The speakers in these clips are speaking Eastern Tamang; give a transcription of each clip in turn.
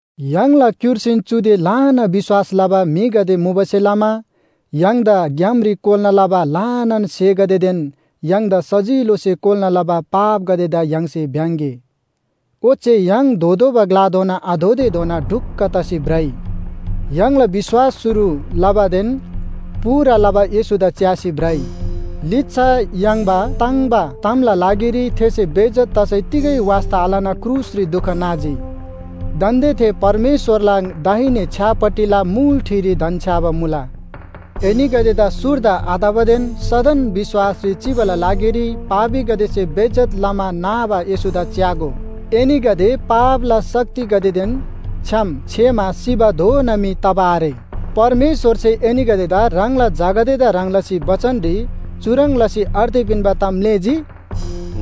य्‍हाङला क्‍युर्सीन चुदे ल्‍हाना विश्‍वास लबा म्‍हिगदे मुबासे लमा य्‍हाङदा ग्‍यामरी कोल्‍ना लबा ल्‍हानान स्‍हेगदेदेन य्‍हाङदा सजिलोसे कोल्‍ना लबा पापगदेदा य्‍हाङसे भ्‍याङ्‌गे। ओच्‍छे य्‍हाङ धोतोःबा ग्‍लाधोना आधोतेधोना ढुक्‍क तसी भ्रइ। य्‍हाङला विश्‍वास शुरु लबादेन पूरा लबा येशूदा च्‍यासी भ्रइ। लिच्‍छा याङ्बा ताङ्‍बा तामला लागिरी थेसे बेइज्‍जत तसै तिगै वास्‍ता आलना क्रुसरी दुख नाजी। दान्‍दे थे परमेश्‍वरला दाहिने छ्‌यापट्टिला मुल ठिरी धन्‍छ्‌याबा मुला। एनीगदेदा सुर्दा आतबादेन सदन विश्‍वासरी चिबाला लागिरी पापीगदेसे बेइज्‍जत लमा नाबा येशूदा च्‍यागो। एनीगदे पापला शक्तिगदेदेन छ्‌याम छेमा सिबाधोना मी तबा आरे। परमेश्‍वरसे एनीगदेदा ह्राङला झागदेदा ह्रङ् लसी बचनरी चुह्रङ् लसी अर्ती पिन्‍बा ताम म्‍लेःजी?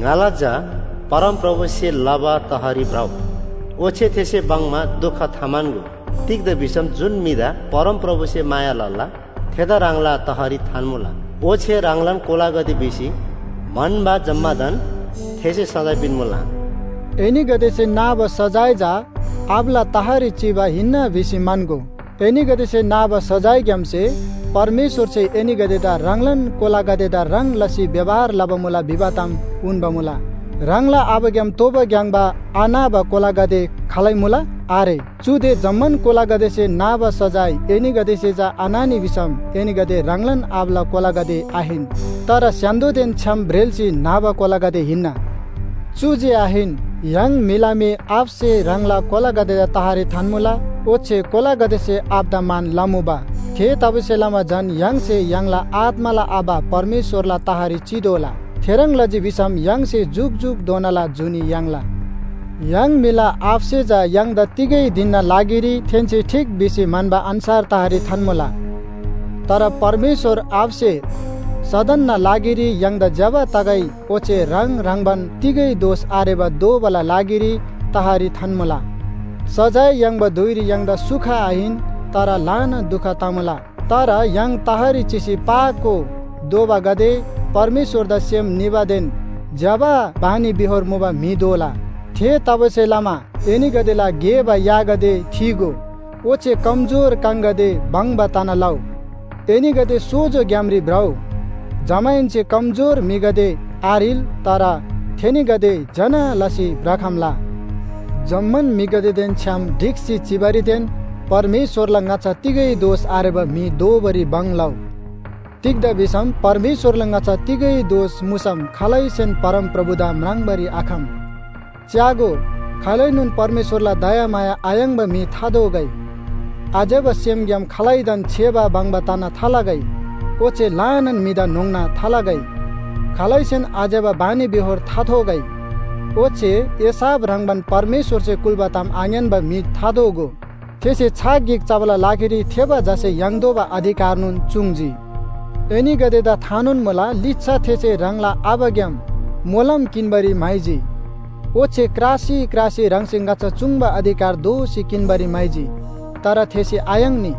“ङाला झा, परमप्रभुसे लबा तहरी भ्रउ। ओच्‍छे थेसे बङ्‌मा दुख थाम्‍हन्‍गो। तिग्‍दा भिसम जुन म्‍हिदा परमप्रभुसे माया लला थेदा ह्राङला तहरी थान्‍मुला। ओच्‍छे ह्राङलान कोलागदे भिसी म्‍हन्‍बा जम्‍मादान थेसे सजाय पिन्‍मुला।” एनीगदेसे नाबा सजाय चा आबाला तहरी चिबा हिन्‍ना भिसी म्‍हन्‍गो। एनीगदेसे नाबा सजायग्‍यामसे परमेश्‍वरसे एनीगदेदा ह्राङलान कोलागदेदा ह्रङ् लसी व्‍यवहार लबा मुला भिबा ताम उन्‍बा मुला। ह्राङला आबाग्‍याम तोबा ग्‍याङ्‍बा आनाबा कोलागदे खालै मुला? आरे। चुदे जम्‍मान कोलागदेसे नाबा सजाय एनीगदेसे चा आनानी भिसम एनीगदे ह्राङलान आबाला कोलागदे आहिन, तर स्‍य्‍हान्‍दोदेन छ्‌याम ब्रेल्‍सी न्‍हबा कोलागदे हिन्‍ना। चु जे आहिन, य्‍हाङ म्‍हिला मी आबासे ह्राङला कोलागदेदा तहरी थान्‍मुला, ओच्‍छे कोलागदेसे आबादा मान लमुबा। थेतबासेलमा झन य्‍हाङसे य्‍हाङला आत्‍माला आबा परमेश्‍वरला तहरी चितोःला। थेह्रङ् लजी भिसम य्‍हाङसे जुकजुकधोनाला जुनी याङ्ला। य्‍हाङ म्‍हिला आबासे चा य्‍हाङदा तिगै धिनना लागिरी थेन्‍से ठीक भिसी म्‍हन्‍बा अन्‍छार तहरी थान्‍मुला। तर परमेश्‍वर आबासे सदनना लागिरी य्‍हाङदा ज्‍यबा तगै ओच्‍छे ह्राङ ह्रङ्‌बान तिगै दोष आरेबा दोबाला लागिरी तहरी थान्‍मुला। सजाय याङ्बा धुइरी य्‍हाङदा सुख आहिन, तर ल्‍हाना दुख तमुला। तर य्‍हाङ तहरी चिसी पाको दोबागदे परमेश्‍वरदा सेम निबादेन ज्‍यबा बानीबेहोर मुबा म्‍हि दोला। थेतबासेलमा एनीगदेला घेबा यागदे थीगो। ओच्‍छे कमजोर काङगदे भङ्‍बा तना लउ। एनीगदे सोजो ग्‍यामरी भ्रउ। जमाहेन्‍से कमजोर म्‍हिगदे आह्रिल, तर थेनीगदे ज्‍यना लसी भ्रखम्‍ला। जम्‍मान म्‍हिगदेदेन छ्‌याम ढिक्‍सी चिबारीदेन परमेश्‍वरला ङाच्‍छा तिगै दोष आरेबा म्‍हि दोबारी भङ लउ। तिग्‍दा भिसम परमेश्‍वरला ङाच्‍छा तिगै दोष मुसम खालैसेन परमप्रभुदा म्राङ्बारी आखम। च्‍यागो, खालैनोन परमेश्‍वरला दयामाया आयाङ्‍बा म्‍हि थादोगै। आज्‍यबा सेमग्‍याम खालैदान छेबा बङ्बा तना थालगै, ओच्‍छे ल्‍हानान म्‍हिदा न्‍होङ्ना थालगै। खालैसेन आज्‍यबा बानीबेहोर थाथोगै। ओच्‍छे एसाव ह्रङ्‌बान परमेश्‍वरसे कुल्‍बा ताम आङ्‌यान्‍बा म्‍हि थादोगो। थेसे छाक गिक चबाला लागिरी थेबा झासे याङ्तोःबा अधिकारदान चूङ्‌जी। एनीगदेदा थानोन मुला, लिच्‍छा थेसे ह्राङला आबाग्‍याम मोलम किन्‍बारी म्‍हाइजी। ओच्‍छे क्रासी क्रासी ह्राङसे ङाच्‍छा चूङ्बा अधिकार दोःसी किन्‍बारी म्‍हाइजी। तर थेसे आयाङ्नी।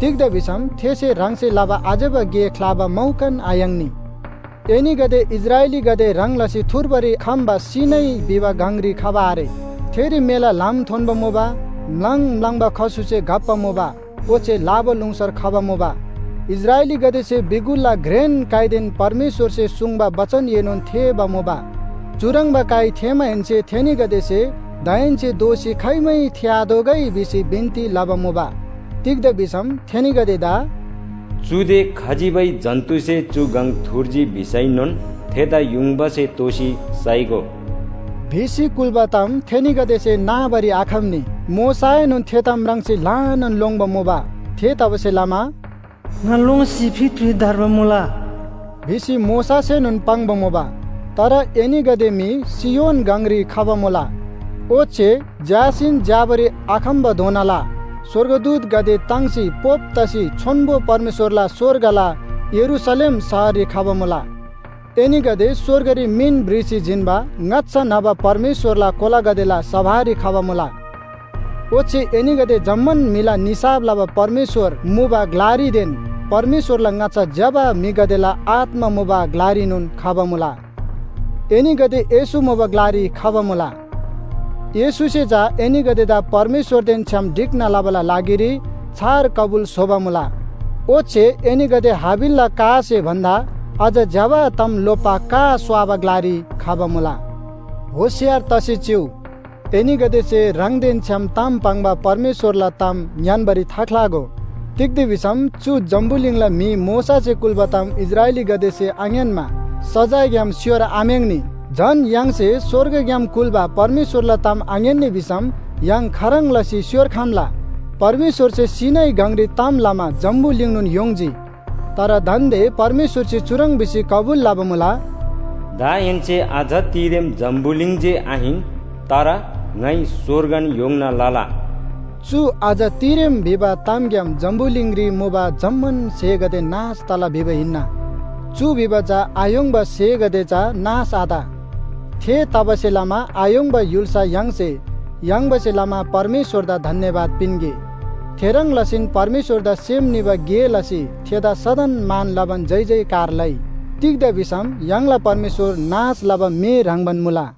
तिग्‍दा भिसम थेसे ह्राङसे लबा आज्‍यबा गे ख्‍लाबा मौकान आयाङ्नी। एनीगदे इस्राएलीगदे ह्रङ् लसी थुर्बारी खम्‍बा सीनै भिबा गङरी खबा आरे। थेरी मेला ल्‍हाम थोन्‍बा मुबा, म्‍लाङ म्‍लाङबा खसुसे घप्‍बा मुबा, ओच्‍छे लाबालुङसर खबा मुबा। इस्राएलीगदेसे बिगुलला घ्रेन काइदेन परमेश्‍वरसे सुङ्बा बचनएनोन थेःबा मुबा। चुह्रङ्बा काइ थेःमाहेन्‍से थेनीगदेसे दाहेन्‍से दोःसी खाइमै थेःआतोःगै भिसी बिन्‍ती लबा मुबा। तिग्‍दा भिसम थेनीगदेदा “चुदे खजिबै जन्‍तुसे चु गङ थुर्जी भिसैनोन थेदा युङबासे तोसी साइगो” भिसी कुल्‍बा ताम थेनीगदेसे नाबारी आखम्‍नी। मोशाएनोन थे ताम म्राङ्सी ल्‍हानान लोङ्‌बा मुबा। थेतबासेलमा, “ङा लोङ्सी फितफित धर्बा मुला” भिसी मोशासेनोन पाङ्बा मुबा। तर एनीगदे मी सियोन गङरी खबा मुला। ओच्‍छे झ्‍यासीन झ्‍याबारी आखम्‍बाधोनाला स्‍वर्गदूतगदे ताङ्सी पोप तसी छोन्‍बो परमेश्‍वरला स्‍वर्गला यरूशलेम शहररी खबा मुला। एनीगदे स्‍वर्गरी मिन भ्रिसी जिन्‍बा ङाच्‍छा न्‍हबा परमेश्‍वरला कोलागदेला सभारी खबा मुला। ओच्‍छे एनीगदे जम्‍मान म्‍हिला निसाफ लबा परमेश्‍वर मुबा ग्‍लारीदेन परमेश्‍वरला ङाच्‍छा ज्‍यबा म्‍हिगदेला आत्‍मा मुबा ग्‍लारीनोन खबा मुला। एनीगदे येशू मुबा ग्‍लारी खबा मुला। येशूसे चा एनीगदेदा परमेश्‍वरदेन छ्‌याम ढिक्‍ना लबाला लागिरी छार कबुल स्‍होबा मुला। ओच्‍छे एनीगदे हाबिलला कासे भन्‍दा अझ ज्‍यबा ताम लोप्‍बा का स्‍वाबा ग्‍लारी खबा मुला। होशियार तसी चिउ, एनीगदेसे ह्राङदेन छ्‌याम ताम पाङ्बा परमेश्‍वरला ताम ङ्‌यान्‍बारी थाख्‍लागो। तिग्‍दा भिसम चु जम्‍बुलिङला म्‍हि मोशासे कुल्‍बा ताम इस्राएलीगदेसे आङ्‌यान्‍मा सजायग्‍याम स्‍योरआम्‍याङ्‌नी। झन य्‍हाङसे स्‍वर्गग्‍याम कुल्‍बा परमेश्‍वरला ताम आङ्‌यान्‍नी भिसम य्‍हाङ खाह्रङ् लसी स्‍योर्खम्‍ला? परमेश्‍वरसे सीनै गङरी ताम लमा जम्‍बुलिङनोन य्‍होङ्जी। तर दान्‍दे परमेश्‍वरसे चुह्रङ् भिसी कबुल लबा मुला, “दाहेन्‍से अझ तिरेम जम्‍बुलिङ जे आहिन, तर ङाइ स्‍वर्गन य्‍होङ्ना लला।” चु “अझ तिरेम” भिबा तामग्‍याम जम्‍बुलिङरी मुबा जम्‍मान स्‍हेगदे नाश तला भिबा हिन्‍ना। चु भिबा चा आय्‍होङ्बा स्‍हेगदे चा नाश आत। थेतबासेलमा आय्‍होङ्बा य्‍हुल्‍सा य्‍हाङसे याङ्बासे लमा परमेश्‍वरदा धन्‍यवाद पिन्‍गे। थेह्रङ् लसीन परमेश्‍वरदा सेम निबा गे लसी थेदा सदन मान लबान जयजयकार लइ। तिग्‍दा भिसम य्‍हाङला परमेश्‍वर नाश लबा मे ह्रङ्‌बान मुला।